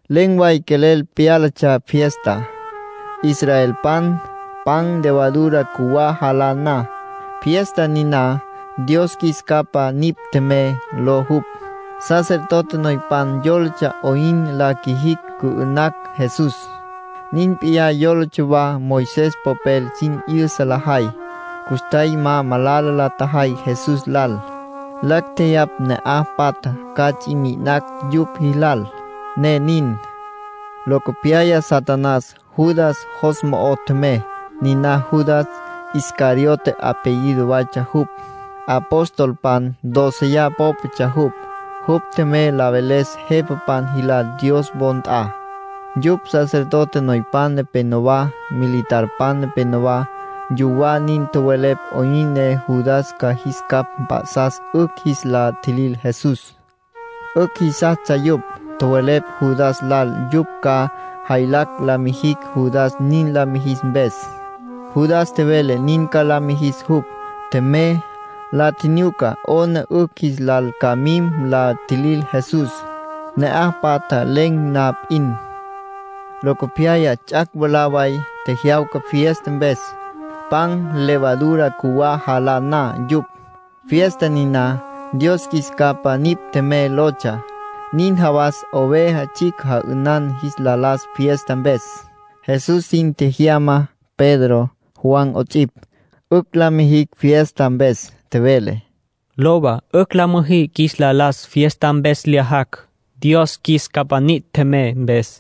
Len̈ way quelel pyálatsja fiesta, israelpan pan levadura cjuwá jalá na. Fiesta niná “Dios Qjuis Capa Nipj Tjemey” ló jupj. Sacerdote noypan yólatsja 'oyn la qjuijicj cü'ü'nacj Jesús. Nin p'iyá yólatsja wa Moisés popel sin 'yüsa lajay. Custjay ma malala la tjajay Jesús lal. Lacj tjeyapj ne'aj patja ca ts'i mi'inacj yupj jilal, ne nin. Locopyaya Satanás Judas jos mo'o tjemey. Niná Judas, “Iscariote” apellido waytsja jupj. Apostolpan dóceya pópatsja jupj. Jupj tjemey la veles jepapan jilal Dios wo nt'a, yupj sacerdote noypan nepenowá, militarpan nepenowá. Yuwá nin tjowelepj 'oyn ne Judas ca jis capj mp'a'sas 'ücj jis la tjilil Jesús. 'Ücj jisastsja yupj. Tjowelepj Judas lal yupj ca jaylacj la mijicj Judas nin la mijis mpes. Judas tjevele nin ca la mijis jupj. Tjemey, la tjinyuca 'ona 'ücj jis lal ca mim la tjilil Jesús, ne'aj patja len̈ na p'in. Locopyaya ts'ac' mwalá way tjejyawca fiesta mpes, pan levadura cjuwá jalá na yupj. Fiesta niná “Dios Qjuis Capa Nipj Tjemey” lotsja. Nin jawas oveja tsjicj ja'ünan jis la las fiesta mpes. Jesús sin tjejyama Pedro, Juan 'ots'ipj, 'ücj la mijicj fiesta mpes. Tjevele: —Lowa, 'ücj la müjí qjuis la las fiesta mpes lyajacj, “Dios Qjuis Capa Nipj Tjemey” mpes.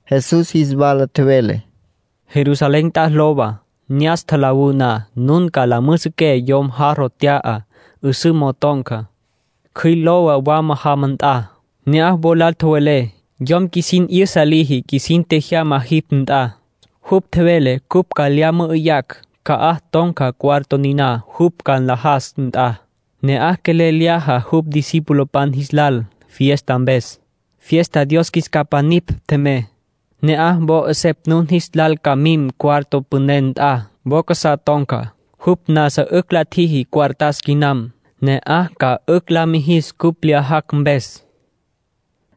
Jesús jis wala tjevele: —Jerusalén nt'a lowa. Ne'as tjalawú na, nun la müjüsüqué yom jarro t'ya, 'üsǘ mo'o ton̈ca. Cjüil lowa wama jama nt'a. Ne'aj wo lal tjowelé: ‘Yom qjuisin 'yüsa liji qjuisin tjejyama jipj nt'a. Jupj tjevele cupj ca lya mü'üyacj ca'aj ton̈ca cuarto niná jupj ca nlajas nt'a. Ne'aj quelel lyaja jupj discipulopan jis lal fiesta mpes, fiesta “Dios Qjuis Capa Nipj Tjemey” ló.’ Ne'aj wo 'esepj nun jis lal ca mim cuarto püné nt'a, wo casá ton̈ca. Jupj nasa 'ücj la tjiji cuartas quinam. Ne'aj ca 'ücj la müjí cupj lyajacj mpes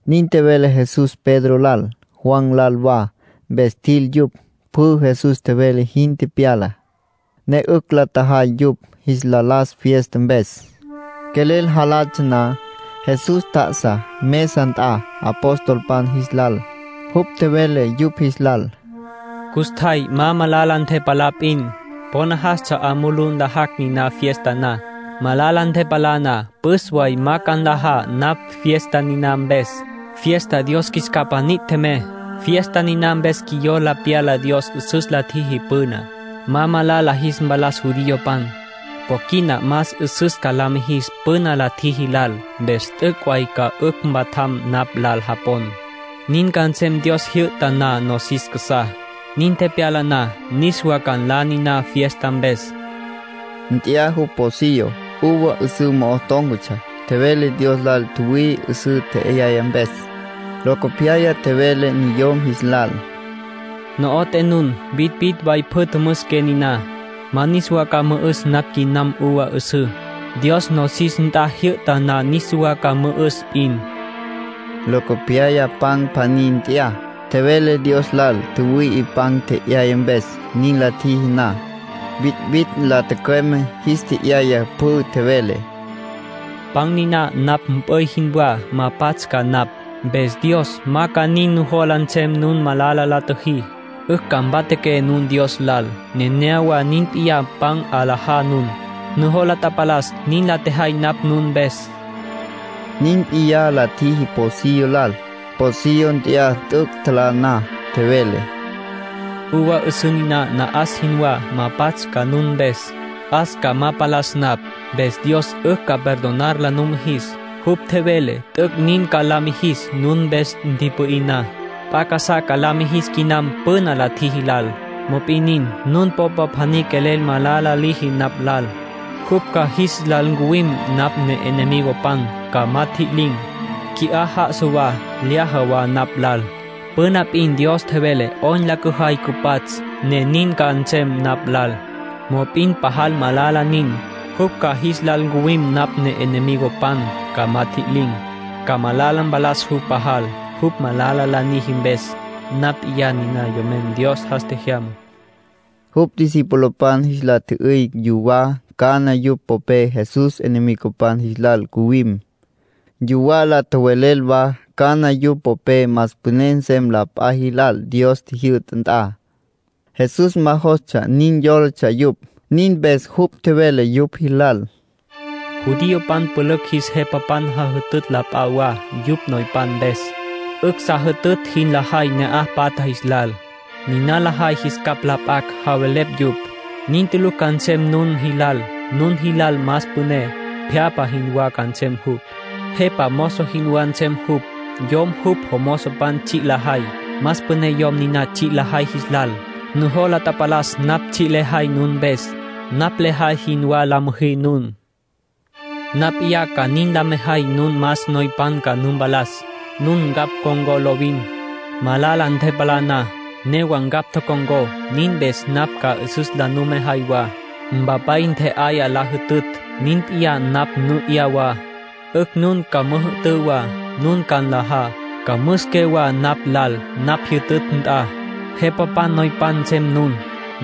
—nin tjevele Jesús Pedro lal, Juan lal wa. Mpes tjil yupj. Pjü Jesús tjevele jin tepyala, ne 'ücj la tjajay yupj jis la las fiesta mpes. Quelel jalatsja na, Jesús tjá'asa mesa nt'a apostolpan jis lal. Jupj tjevele yupj jis lal: —Custjay ma malala ntepalá p'in, po najastsja 'a mulú nlajacj niná fiesta na. Malala ntepalá na püs way ma ca nla napj fiesta niná mpes, fiesta ‘Dios Qjuis Capa Nipj Tjemey’ ló. Fiesta niná mpes qjuiyola pyala Dios 'üsüs la tjiji püná, ma malala jis mpalas judiopan. Po quina más 'üsüs ca la mijis püna la tjiji lal, mpes t'üc' way ca 'ücj mpatjam napj lal japon. Nin ca nsem Dios jyü'ta na nosis casá. Nin tepyala na, niswa ca nla niná fiesta mpes —tjevele Jesús. Nt'ya jupj pocillo, uva 'üsǘ mo'o tón̈catsja. Tjevele Dios lal tjüwüi'i 'üsǘ tje'yaya mpes. Locopyaya tjevele niyom jis lal: —No'oté nun, vitvitj way pjü tjümüsiqué niná. Ma niswa ca mü'üs napj quinam uva 'üsǘ. Dios nosis nt'a jyü'ta na niswa ca mü'üs p'in. Locopyaya pan pjaní nt'ya, tjevele Dios lal tjüwüi'i pan tje'yaya mpes. Nin la tjiji na, vitvitj la tücüeme, jis tje'yaya pjü. Tjevele: —Pan niná napj mp'üy jinwá. Ma pats' ca napj, mpes Dios ma ca nin jola nsem nun malala la tjüjí. 'Ücj ca mpatjaqué nun Dios lal. Nenéyawa nin p'iyá pan 'alajá nun. Nujola tapalas nin la tjejay napj nun mpes —tjevele jupj. Nin p'iyá la tjiji pocillo lal. Pocillo nt'ya t'üc' tjalá na. Tjevele: —Uva 'üsǘ niná na'as jinwá. Ma pats' ca nun mpes. 'As ca ma palas napj, mpes Dios 'ücj ca perdonar la numijis. Jupj tjevele t'üc' nin ca la mijis nun mpes ntipü'í na. P'a casá ca la mijis quinam püna la tjiji lal. ”Mop'in nin, nun popa pjaní quelel malala liji napj lal. Jupj ca jis lal ncuwim napj ne'enemigopan, ca ma tjililin̈. Qui'á já'asa wa, lyaja wa napj lal. Püna p'in Dios tjevele 'oyn la cüjay cüpats', ne nin ca nsem napj lal. Mop'in pajal malala nin, jupj ca jis lal ncuwim napj ne'enemigopan, ca ma tjililin̈. Ca malala mpalas jupj pajal, jupj malala la niji mpes. Napj p'iyá niná Yomen Dios jas tjejyamá —tjevele jupj. Jupj discipulopan jis la tjü'üy yuwá cana yupj popé Jesús enemigopan jis lal ncuwim. Yuwá la tjowelel wa cana yupj popé más püné nsem la p'a jilal Dios jyü'ta nt'a. (Jesús ma jostsja nin yólatsja yupj.) Nin mpes jupj tjevele yupj jilal: —Judiopan tulucj jis jepapan jajütütj la p'a wa, yupj noypan mpes. 'Ücj sa jajütütj jin lajay ne'aj patja jis lal. Niná lajay jis capj la p'acj, javelepj yupj. Nin tulucj ca nsem nun jilal. Nun jilal más püné, pjyapja jinwá ca nsem jupj. Jepa ca mozo jinwá nsem jupj. Yom jupj jomozopan tsji' lajay, más püné yom niná tsji' lajay jis lal. Nujola tapalas napj tsji' lejay nun mpes. Napj lejay jinwá la müjí nun. ”Napj p'iyá ca nin la mejay nun más noypan ca nu mpalas. Nun ncapj tocon̈có lovin. Malala ntepalá na, newa ncapj tocon̈có. (Nin mpes napj ca 'üsüs la numejay wa.) Mpapay ntje'aya la jütütj. Nin p'iyá napj nu 'ya wa 'ücj nun ca müjü'tǘ wa. Nun ca nlajá, ca müsiqué wa napj lal napj jyütütj nt'a. Jepapan noypan nsem nun.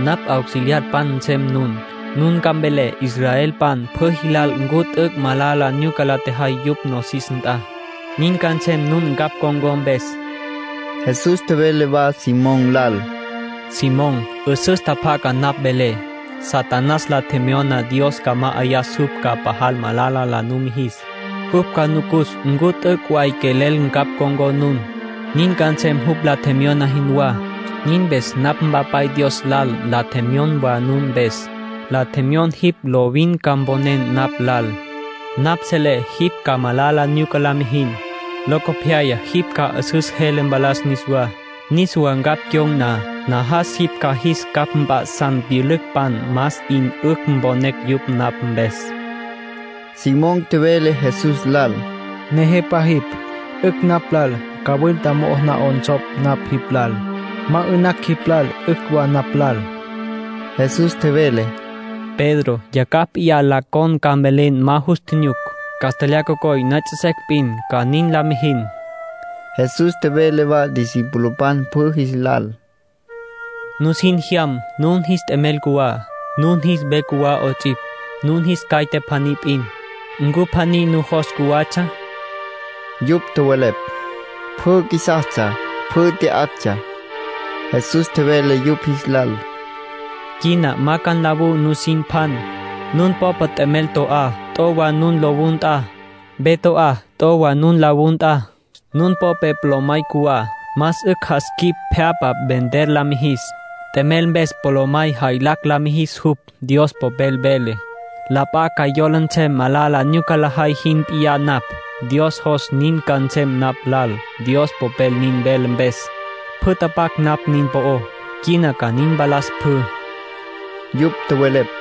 Napj auxiliarpan nsem nun. Nun ca mvelé israelpan pjü jilal ncu t'üc' malala nyuca la tjajay yupj nosis nt'a. Nin ca nsem nun ncapj con̈có mpes. Jesús tjevele wa Simón lal: —Simón, 'üsüs tjapjaca napj velé. Satanás la tjemyona Dios ca ma'ayas jupj ca pajal malala la numijis. Jupj ca nucus ncu t'üc' way quelel ncapj con̈có nun. Nin ca nsem jupj la tjemyona jinwá. Nin mpes napj Mpapay Dios lal la tjemyon wa nun mpes. La tjemyon jipj lovin ca mponen napj lal. (Napj selé jipj ca malala nyuca la mijin. Locopyaya jipj ca 'üsüs jele mpalas niswá. Niswa ncapj cyon̈ na, najas jipj ca jis capj mp'a'san pyülücpan más 'in 'ücj mponecj yupj napj mpes.) Simón tjevele Jesús lal: —Nejepa jipj. 'Ücj napj lal cawilta mo'o na 'onsopj napj jipj lal. Ma 'ü'nacj jipj lal 'ücj wa napj lal. Jesús tjevele: —Pedro, yacjaj p'iyá la con ca mvelen ma nus nyuc. Castlyaj cocoy la puyú secj p'in, ca nin la mijin. Jesús tjevele wa discipulopan pjü jis lal: —Nusin tjejyam nun jis t'emel cjuwá, nun jis ve cjuwá 'ots'ipj, nun jis caite pjaní p'in. ¿Ncu pjaní nujos cjuwatsja? Yupj tjowelepj: —Pjü qjuisastsja, pjü tya'actsja. Jesús tjevele yupj jis lal: —Quina ma ca nlawú nusin pjan. Nun popé t'emel to'á, t'o wa nun lowú nt'a. Ve to'á, t'o wa nun lowú nt'a. Nun popé polomay cjuwá, más 'ücj jas quip pje'apa vender ca la mijis, t'emel mpes polomay ca jaylacj la mijis jupj. Dios Popel vele: ‘La p'a ca yola nsem malala nyuca lajay jin p'iyá napj’. Dios jos nin ca nsem napj lal, Dios Popel nin vele mpes. Pjü tapac napj nin po'ó, quina ca nin mpalas pjü —tjevele Jesús. Yupj tjowelepj: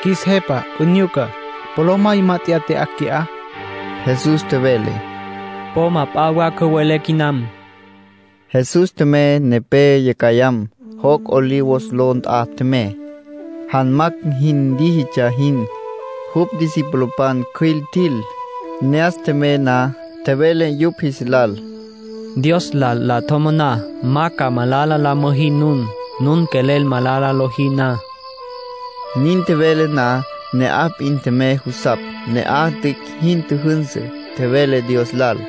—Qjuis Jepa, 'unyuca. Polomay mát'eya tya'acj qui'á. Jesús tjevele: —Po ma p'a wa cüwelé quinam. Jesús tjemey nepé yacjayam. Joc' Olivos ló nt'a tjemey, janmacj jin líjitsja jin. Jupj discipulopan cjüil tjil. Ne'as tjemey na, tjevele yupj jis lal: “Dios lal la tjomoná ma ca malala la müjí nun, nun quelel malala lojí na”. Nin tjevele na, ne'aj p'in tjemey jusapj. Ne'aj tüic' jin tjüjünsü, tjevele Dios lal.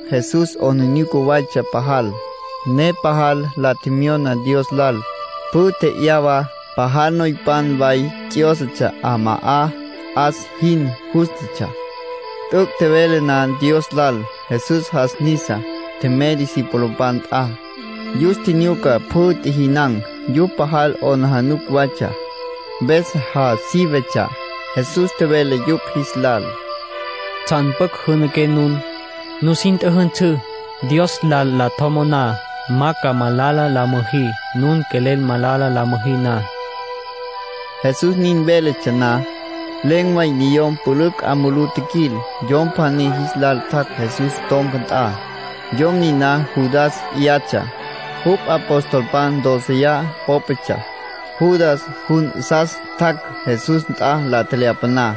Jesús 'aplijila waytsja pajal, ne pajal la tjemyona Dios lal. Pjü tji'yawa. Pajal noypan way ts'yósatsja 'ama'á, 'as jin jústatsja. T'üc' tjevele na Dios lal, Jesús jas nisa, tjemey discipulopan nt'a. Yus tjinyuca pjü tjijinan̈. Yupj pajal 'aplijila waytsja, mpes ja sívetsja. Jesús tjevele yupj jis lal: “¿Tsjan pjucj jünaqué nun? Nusin tjüjünsǘ, Dios lal la tjomoná ma ca malala la müjí nun quelel malala la müjí na.” Jesús nin véletsja na, len̈ way niyom pülücj 'a mulú tjiquil. Yom pjaní jis lal tjac' Jesús ton̈ca nt'a. Yom niná Judas p'iyatsja. Jupj apostolpan dóceya pópatsja. Judas jun 'asas tjac' Jesús nt'a la tjelyapaná.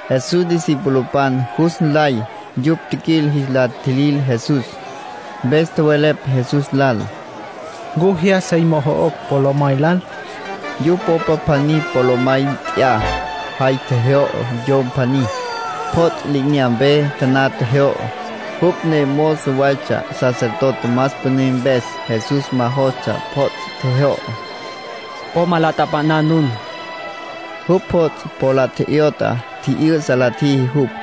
Jesús discipulopan jus nlay yupj tjiquil jis la tjilil Jesús, mpes tjowelepj Jesús lal: —¿Ncu jyas sey mojo'ocj polomay lal? Yupj popa pjaní polomay nt'ya, jay tjejyo'o yom pjaní. Pjots' li'inyampe taná tjejyo'o. Jupj ne mozo waytsja sacerdote más püné mpes. Jesús ma jostsja pjots' tjejyo'o. —Po ma la tapa'ná nun —tjevele jupj. Jupj pjots' po la tje'yot'a, tji'yü'sa la tjiji jupj.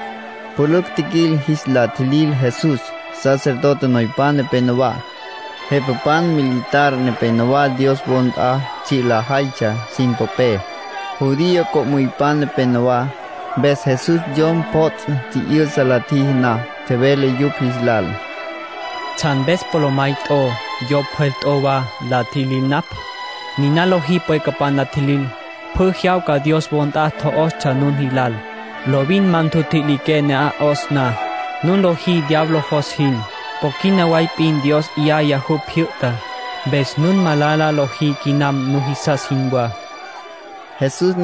Pülücj tjiquil jis la tjilil Jesús. Sacerdote noypan nepenowá, jepapan militar nepenowá Dios wo nt'a tsji' lajaytsja sin popé. Judío co'müypan nepenowá. Mpes Jesús yom pjots' tji'yü'sa la tjiji na, tjevele yupj jis lal: —¿Tsjan mpes polomay t'o, yo pjwel t'o wa la tjilil napj? Niná lojí pwequepj la tjilil. Pjü jyawca Dios wo nt'a tjo'ostsja nun jilal. Lovin ma ntjutjililiqué ne'aj tjo'os na. Nun lojí diablo jos jin. Po quina way p'in Dios 'yaya jupj jyü'ta, mpes nun malala lojí quinam nujisas jinwá —tjevele Jesús.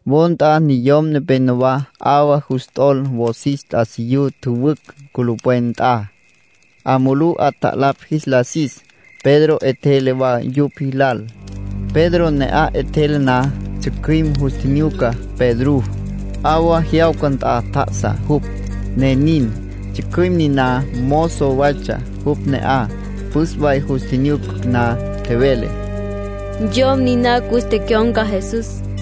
Wo nt'a niyom nepénowa 'awa jus t'ol wosis t'asiyú tjüwücj culupwen nt'a, 'a mulú 'atjalapj jis la sis. Pedro 'etjele wa yupj jilal. Pedro ne'aj 'etjele na, tsjücjüim jus tjinyuca Pedrú, 'awa jyawca nt'a tjá'asa jupj, ne nin. Tsjücjüim niná mozo waytsja jupj ne'aj. Püs way jus tjinyuca na, tjevele: —Yom niná cus tecyon̈ca Jesús.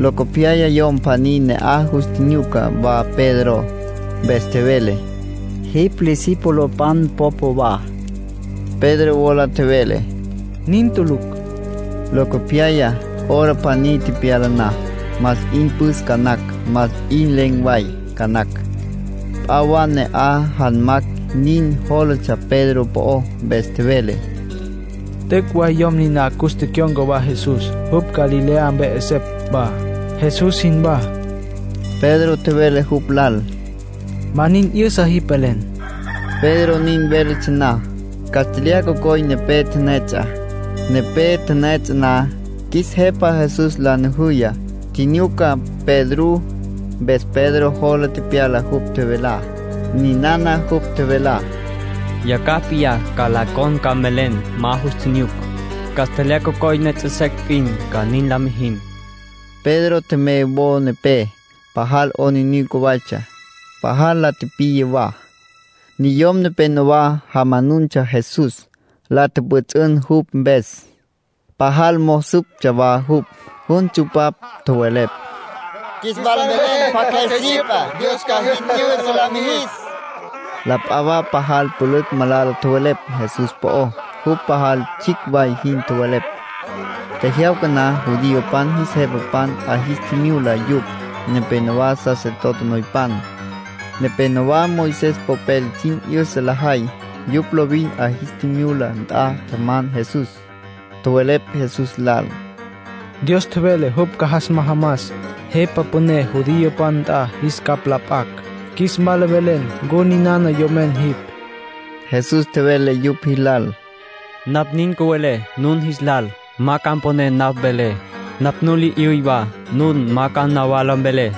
Locopyaya yom pjaní ne'aj jus tjinyuca wa Pedro, mpes tjevele: —Jipj Jesús discipulopan popa wa. Pedro wola tjevele: —¡Nin tulucj! Locopyaya, hora pjaní tepyala na, más 'in püs ca nacj, más 'in len̈ way ca nacj, p'a wa ne'aj janmacj nin jólatsja Pedro po'ó, mpes tjevele: —T'üc' way yom niná cus tecyon̈ca wa Jesús. Jupj Galilea mpe 'esepj wa, Jesús jinwá. Pedro tjevele jupj lal: —Ma nin 'yüsa jipj velen. Pedro nin véletsja na, castlyaj cocoy nepé la tipiya. Nepé la tipiya na, qjuis Jepa Jesús la nujuya, tjinyuca Pedrú. Mpes Pedro jola tepyala jupj tjevelá. Ninana jupj tjevelá: “Yacjaj p'iyá la con ca mvelen ma nus nyuc. Castlyaj cocoy la puyú secj p'in, ca nin la mijin.” Pedro tjemey wo nepé. Pajal 'aplijila waytsja, pajal la tipiya wa. Niyom nepénowa jamanuntsja Jesús. La tjüpjüts'ün jupj mpes. Pajal mo'o süptsja wa jupj. Jun tsupapj, tjowelepj: —Qjuis wala mvelen pjacj jey syüpa. Dios ca jin 'yüsa la mijis. La p'a wa pajal pülücj malala tjowelepj Jesús po'ó, jupj pajal tsjicj way jin tjowelepj. Tjejyawca na, judiopan jis jepapan 'a jis tjimyula yupj, nepénowa sacerdote noypan, nepénowa Moisés popel sin 'yüsa lajay. Yupj lovin 'a jis tjimyula nt'a tjaman Jesús. Tjowelepj Jesús lal: —Dios tjevele jupj ca jas majamas Jepa Püné judiopan nt'a qjuis capj la p'acj. Qjuis wala mvelen ncu ninana yomen jipj. Jesús tjevele yupj jilal: —Napj nin cüvelé nun jis lal, ma ca mponé napj velé. Napj nu la 'yüy wa, nun ma ca nawala mvelé.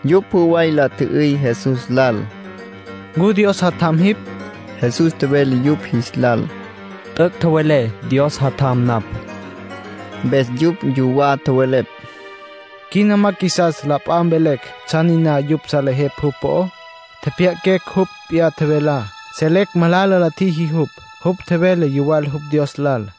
Yupj pjü way la tjü'üy Jesús lal: —¿Ncu Dios Jatjam jipj? Jesús tjevele yupj jis lal: —T'üc' tjowelé, Dios Jatjam napj. Mpes yupj yuwá tjowelepj: —Quina ma qjuisas la p'a mvelecj tsjan niná yupj salejepj jupj po'ó. Tjepjya'aquecj jupj p'iyá tjevelá. Selecj malala la tjiji jupj; jupj tjevele yuwal jupj Dios lal.